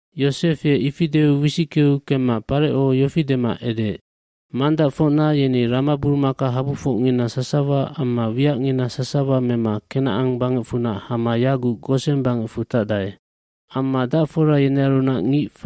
Yosef ye ifi deu wisickeu kemma Pareco yofi dema edeec, “Mangdacfocna yeni ramaburumakahabufocngina sasawa amma wiacngina sasawa mema Kenacan bangecfunac hama yaguc Gosen bangecfu tacdae.” Amma dacfora yenearunac ngic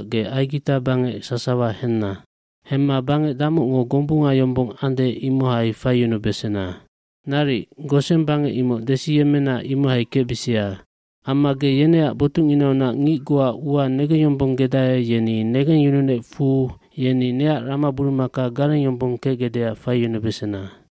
ge Aigita bangec sasawa henna. Hemma bangec damocngo gombunga yombong ande imohai faiyunubesena. Naric, Gosen bangec imoc desiyemmena imohai kecbisia. Amma ge yeneac botucnginaunac ngic goa ua negengyombonggedae yeni negengyununecfu yeni neac ramaburumaka garengyombong kecgecdeac faiyunubesena.”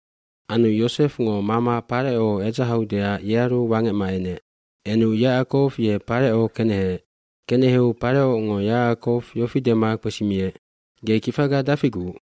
Anu Yosefngo mama Pareco edzahaudeac yearu wangecma enec. Enu Yacakow ye Pareco keneheec. Keneheu Parecongo Yacakow yofi dema kpesimiec, “Ge kifaga dafiguc?”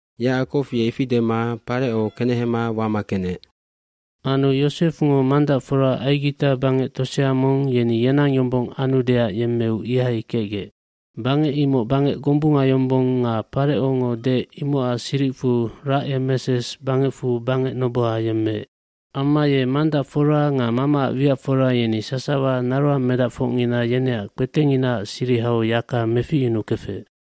Yacakow ye ifi dema Pareco kenehema wama kenec. Anu Yosefngo mangdacfora Aigita bangec tosea mong yeni yenang yombong anudeac yemmeu ihai kecgec. Bangec imoc bangec gombunga yombong nga Parecongo deec imocac siricfu Racemeses bangecfu bangec noboha yemmeec. Amma ye mangdacfora nga mamaac wiacfora yeni sasawa naroangmedacfocngina yeneac kpetecnginaac sirihau yaka meficyunukefec.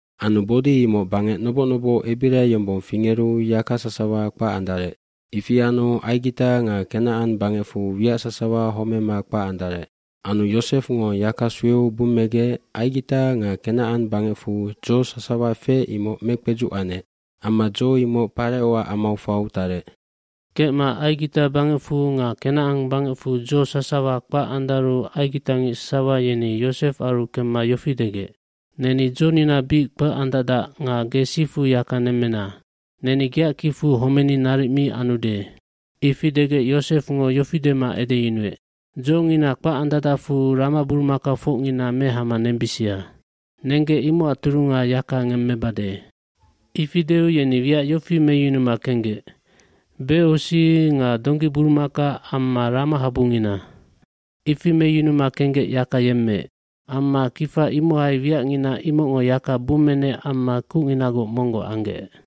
Anu bodi imoc bangec noboc noboc ebira yombong fingeru yaka sasawa kpac andarec. Ifi anu Aigita nga Kenacan bangecfu wiac sasawa homema kpac andarec. Anu Yosefngo yaka sueu bummegec Aigita nga Kenacan bangecfu dzo sasawa feec imoc mekpedzuc anec. Amma dzo imoc Parecoac amau fau tarec. Kecma Aigita bangecfu nga Kenacan bangecfu dzo sasawa kpac andaru aigitangic sasawa yeni Yosefaru kemma yofi degec, “Neni dzonina bic kpac andacdac nga ge sifu yaka nemmena. Neni geac kicfu homeni naric mi anude.” Ifi degec Yosefngo yofi dema edeyunuec, “Dzongina kpac andacdacfu ramaburumakafocngina mehama nembisia. Nenggec imocac turunga yaka ngemmebade.” Ifi deu yeni wiac yofi meyunuma kenggec, becosi nga donggiburumaka amma ramahabungina. Ifi meyunuma kenggec yaka yemmeec. Amma kifa imohai wiacngina imocngo yaka bummenec amma kucnginagoc monggoc anggec.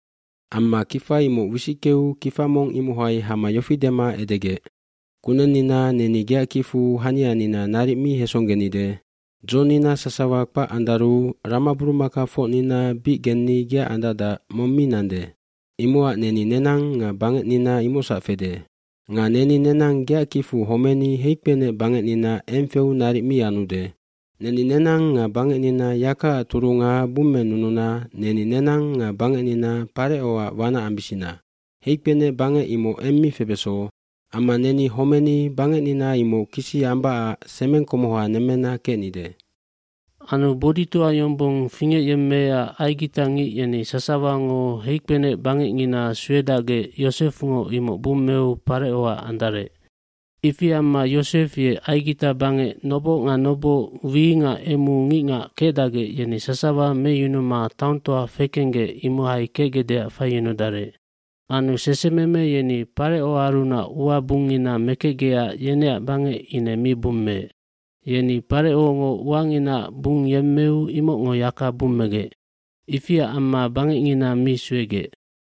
Amma kifa imoc wisickeu kifa mong imohai hama yofi dema edegec, “Kunennina neni geac kicfu hanianina naric mi hesonggenide. Dzonina sasawa kpac andaru ramaburumakafocnina bic genni geac andacdac, mong mi nande. Imocac neni nenang nga bangecnina imocsac fede. Nga neni nenang geac kicfu homeni heikpenec bangecnina eng feu naric mi anude. Neni nenang nga bangecnina yakaac turunga bummenununa neni nenang nga bangecnina Parecoac wanac ambisina. Heikpenec bangec imoc eng mi febeso. Amma neni homeni bangecnina imoc kisi ambacac semeng komoha nemmena kecnide.” Anu boditoa yombong fingecyemmeecac aigitangic yeni sasawango heikpenecbangecngina suedacgec Yosefngo imoc bummeu Parecoac andarec. Ifi amma Yosef ye Aigita bangec noboc nga noboc, wi nga emu ngicngac kecdacgec yeni sasawa meyunuma taongtoa fekenggec imohai kecgecdeac faiyunudarec. Anu sesememe yeni Parecoarunac ua bungngina mekecgecac yeneac bangec ine mi bummeec. Yeni Parecongo uanginaac bungyemmeu imocngo yaka bummegec. Ifiac amma bangecngina mi suegec.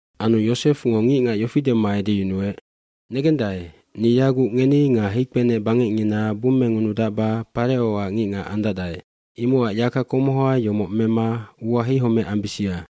Anu Yosefngo ngicngac yofi dema edeyunuec, “Negendae, ni yaguc ngeni nga heikpenecbangecngina bummengunudacba Parecoac ngicngac andacdae. Imocac yaka komoha yomoc mema ua heihomec ambisia.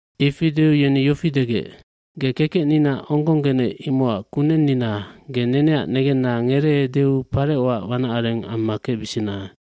Ifi deu yeni yofi degec, “Ge kekecnina onggonggenec imocac kunennina, ge neneac negenna ngereeudeu Parecoac wanacareng amma kecbisina.”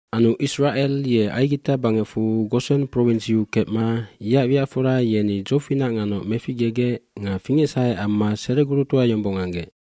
cAnu Isracel ye Aigita bangecfu Gosen provinsiu kecma yeac wiacfora yeni dzofinac nganoc meficgegec nga fingecsahe amma seregurutoa yombong anggec.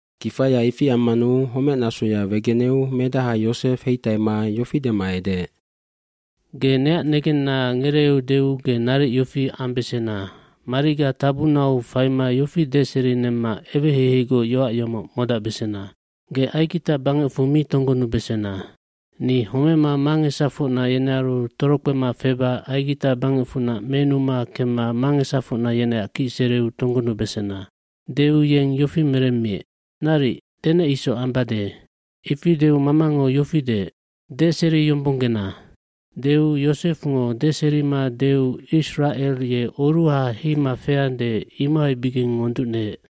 dKifaya ifi ammanu homecnasoya wegeneu medaha Yosef heitaima yofi dema edeec, “Ge neac negenna ngereeudeu ge naric yofi ambesena mariga tabunau faima yofi deserinemma eweheiheigoc yoac yomoc modacbesena. Ge Aigita bangecfu mi tonggonubesena. Ni homema mangesafocna yenearu torokpema feba Aigita bangecfunac menuma kemma mangesafocna yeneac kicsereu tonggonubesena.” Deu yeng yofi meremmiec, “Naric, denec isoc ambade.” eIfi deu mamango yofi deec, “Deseriyombonggena!” Deu Yosefngo deserima deu Isracel ye oruha heima feande imohaibigeng ngonducneec.